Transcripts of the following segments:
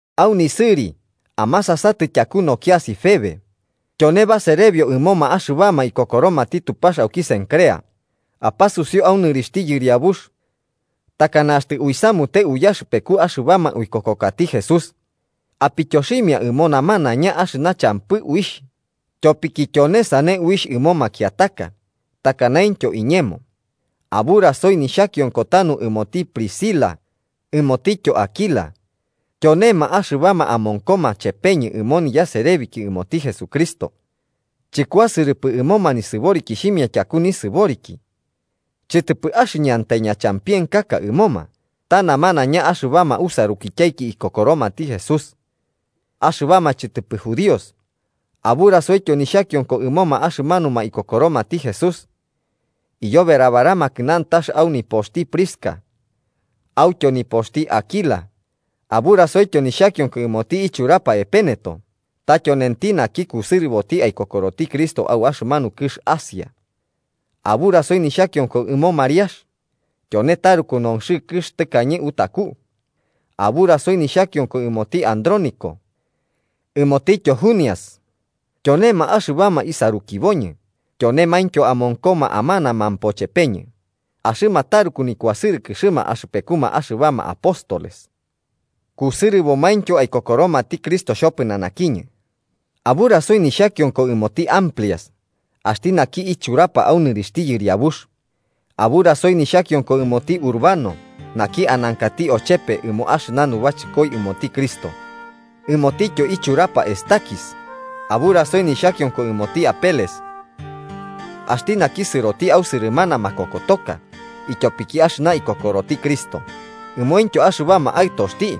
Au nisɨri amasasatɨ tyaku nokiasi Febe, tyone baserebio ɨmoma axɨbama ikokoromati Tupax auki Cencrea. Apasusiu au nɨrixhti Yɨriabux, takana axtɨ uisamute uyaxɨpeku axɨbama uikokokati Jesús, apityoximia ɨmo nanaiña axɨna champɨ uixh, tyopiki tyone sane uixh ɨmo makiataka, takanaintyo iñemo. Aburasoi nixhakionko tanu ɨmoti Priscila ɨmotityo Áquila, tyonema axɨbama amonkoma chepeñɨ ɨmo niyaserebiki ɨmoti Jesucristo. Chɨkuasɨrɨpɨ ɨmoma nisɨborikixhimia tyaku nisɨboriki, chɨtɨpɨ axɨñantai ñachampienkaka ɨmoma, ta namanaiña axɨbama usarukityaiki ikokoromati Jesús, axɨbama chɨtɨpɨ judíos. Aburasoityo nixhakionko ɨmoma axɨmanuma ikokoromati Jesús iyoberabaramakɨ nantax au nipoxti Prisca autyo nipoxti Áquila. Aburasoityo nixhakionko ɨmoti ichurapa Epéneto ta tyonenti naki kusɨrɨboti aikokoroti Cristo au axɨmanu kɨx Asia. Aburasoi nixhakionko ɨmo Mariax, tyone taruku nonxɨkɨx tɨkañe autaku. Aburasoi nixhakionko ɨmoti Andrónico ɨmotityo Junias, tyonema axɨbama isarukiboñɨ tyonemaintyo amonkoma amanamampo chepeñɨ. Axɨma taruku nikuasɨrɨkɨxɨma axɨpekuma axɨbama apóstoles, kusɨrɨbomaintyo aikokoromati Cristo xhopɨnanakiñɨ. Aburasoi nixhakionko ɨmoti Amplias, axti naki ichurapa au nɨrixhti Yɨriabux. Aburasoi nixhakionko ɨmoti Urbano naki anankati ochepe ɨmo axɨna nubachɨkoi ɨmoti Cristo, ɨmotityo ichurapa Estaquis. Aburasoi nixhakionko ɨmoti Apeles, axti naki sɨroti au sɨrɨmana makokotoka ityopiki axɨna ikokoroti Cristo. Ɨmointyo axɨbama aɨtoxti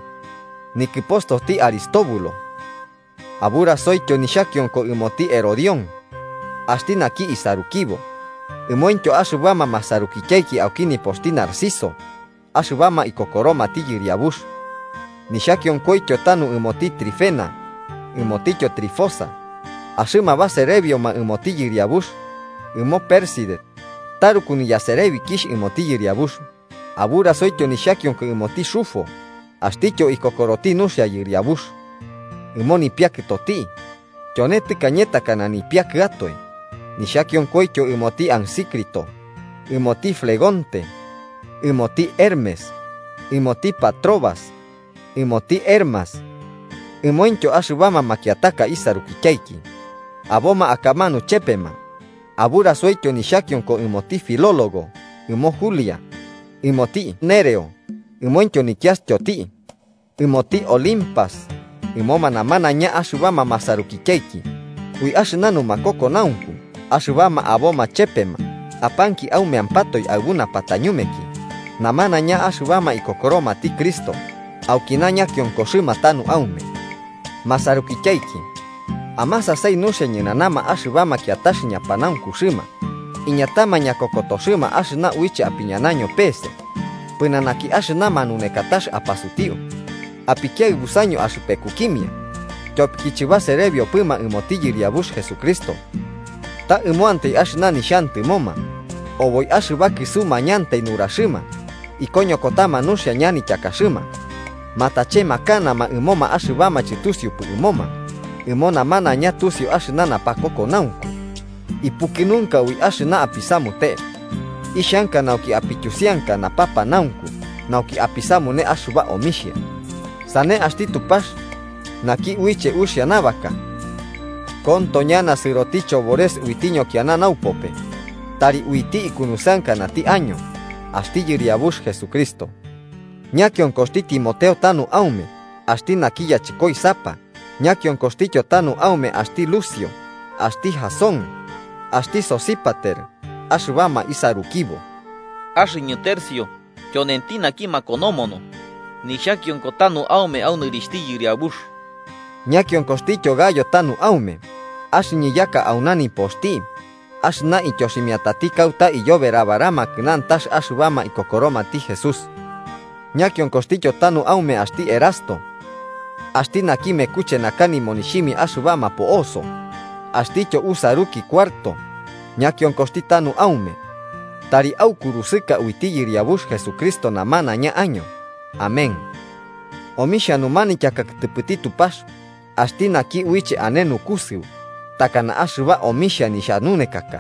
nikɨpostoti Aristóbulo. Aburasoityo nixhakionko ɨmoti Herodión, axti naki isarukibo. Ɨmointyo axɨbama masarukityaiki au nipoxti Narciso axɨbama ikokoromati Yɨriabux. Nixhakionkoityo tanu ɨmoti Trifena ɨmotityo Trifosa, axɨma baserebioma ɨmoti Yɨriabux. Ɨmo Pérside, taruku niyaserebikixh ɨmoti Yɨriabux. Aburasoityo nixhakionko ɨmoti Rufo axtityo ikokoroti nuxia Yɨriabux, ɨmo nipiakɨtoti, tyone tɨkañe takana nipiakɨatoe. Nixhakionkoityo ɨmoti Asíncrito, ɨmoti Flegonte, ɨmoti Hermes, ɨmoti Patrobas, ɨmoti Hermas, ɨmointyo axɨbama makiataka isarukityaiki, aboma akamanu chepema. Aburasoityo nixhakionko ɨmoti Filólogo ɨmo Julia, ɨmoti Nereo ɨmointyo nikiastyoti, ɨmoti Olimpas ɨmoma namanaiña axɨbama masarukityaiki ui axɨna numakokonaunku axɨbama aboma chepema. Apanki aumeampatoe aɨbu napatañumeki. Namanaiña axɨbama ikokoromati Cristo aukina ñakionkoxɨma tanu aume. Masarukityaiki, amasasai nuxia ñɨnana axɨbama kiatax ñapanaunkuxɨma iñatama ñakokotoxɨma axɨna uiche apiñanaño pese pɨnanaki axɨna manunekatax apasutiu. Apikiaɨbusaño axɨpekukimia, tyopiki chɨbaserebiopɨma ɨmoti Yɨriabux Jesucristo, ta ɨmoantai axɨna nixhantɨmoma, oboi axɨba kɨsumañantai nuraxɨma ikoñokotama nuxia ñanityakaxɨma matachemakanama ɨmoma axɨbama chɨtusiupɨ ɨmoma. Ɨmo namanaiña tusiu axɨna napakokonaunku. Ipukɨnunka ui axɨna apisamute, ixhanka nauki apityusianka napapanaunku nauki apisamune axɨba omixhia. Sane axti Tupax naki uiche uxia nabaka konto ñana sɨroti chobores uiti ñokiana naupope. Tari uiti ikunusɨankanati año axti Yɨriabux Jesucristo. Ñakionkoxti Timoteo tanu aume, axti naki yachɨkoisapa. Ñakionkoxtityo tanu aume axti Lucio axti Jasón axti Sosípater, axɨbama isarukibo. Axɨñɨ Tercio, tyonenti naki makonomono, nixhakionko tanu aume au nɨrixhti Yɨriabux. Ñakionkoxtityo Gayo tanu aume. Axɨñɨ yaka auna nipoxti, axɨna ityoximiatati kauta aiyoberabaramakɨ nantax axɨbama ikokoromati Jesús. Ñakionkoxtityo tanu aume axti Erasto, axti naki mekuche naka nimonixhimia axɨbama po'oso axtityo usaruki Cuarto ñakionkoxti tanu aume. Tari aukurusɨka uiti Yɨriabux Jesucristo namanaiña año. Amén. Omixhia numanityaka kɨtɨpɨti Tupax, axti naki uiche ane naukusɨu takana axɨba omixhia nixhanunekaka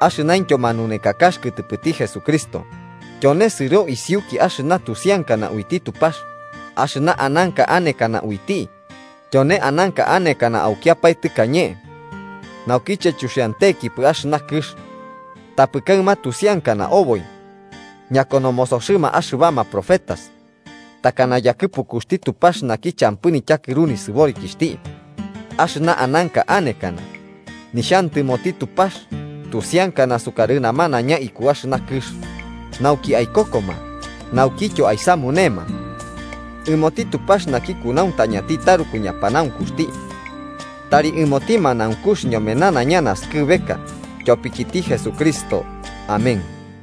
axɨnaintyo manunekakax kɨtɨpɨti Jesucristo. Tyone sɨro isiuki axɨna tusiankana uiti Tupax axɨna ananka anekana uiti, tyone ananka anekana aukiapae tɨkañe naukiche chuxiantenkipɨ axɨna kɨx, tapɨ kaɨma tusiankana oboi ñakonomosoxɨma axɨbama profetas, takana yakɨpukuxti Tupax naki champɨ nityakɨru nisɨborikixhti. Axɨna ananka anekana nixhantɨmoti Tupax tusiankana sukarɨ namanaiña iku axɨna kɨx nauki aikokoma naukityo aisamunema. ¡Ɨmoti Tupax naki kunauntañati taruku ñapanaunkuxti, tari ɨmoti manaunkux ñome nanaiña naskɨbeka, tyopikiti Jesucristo! Amén.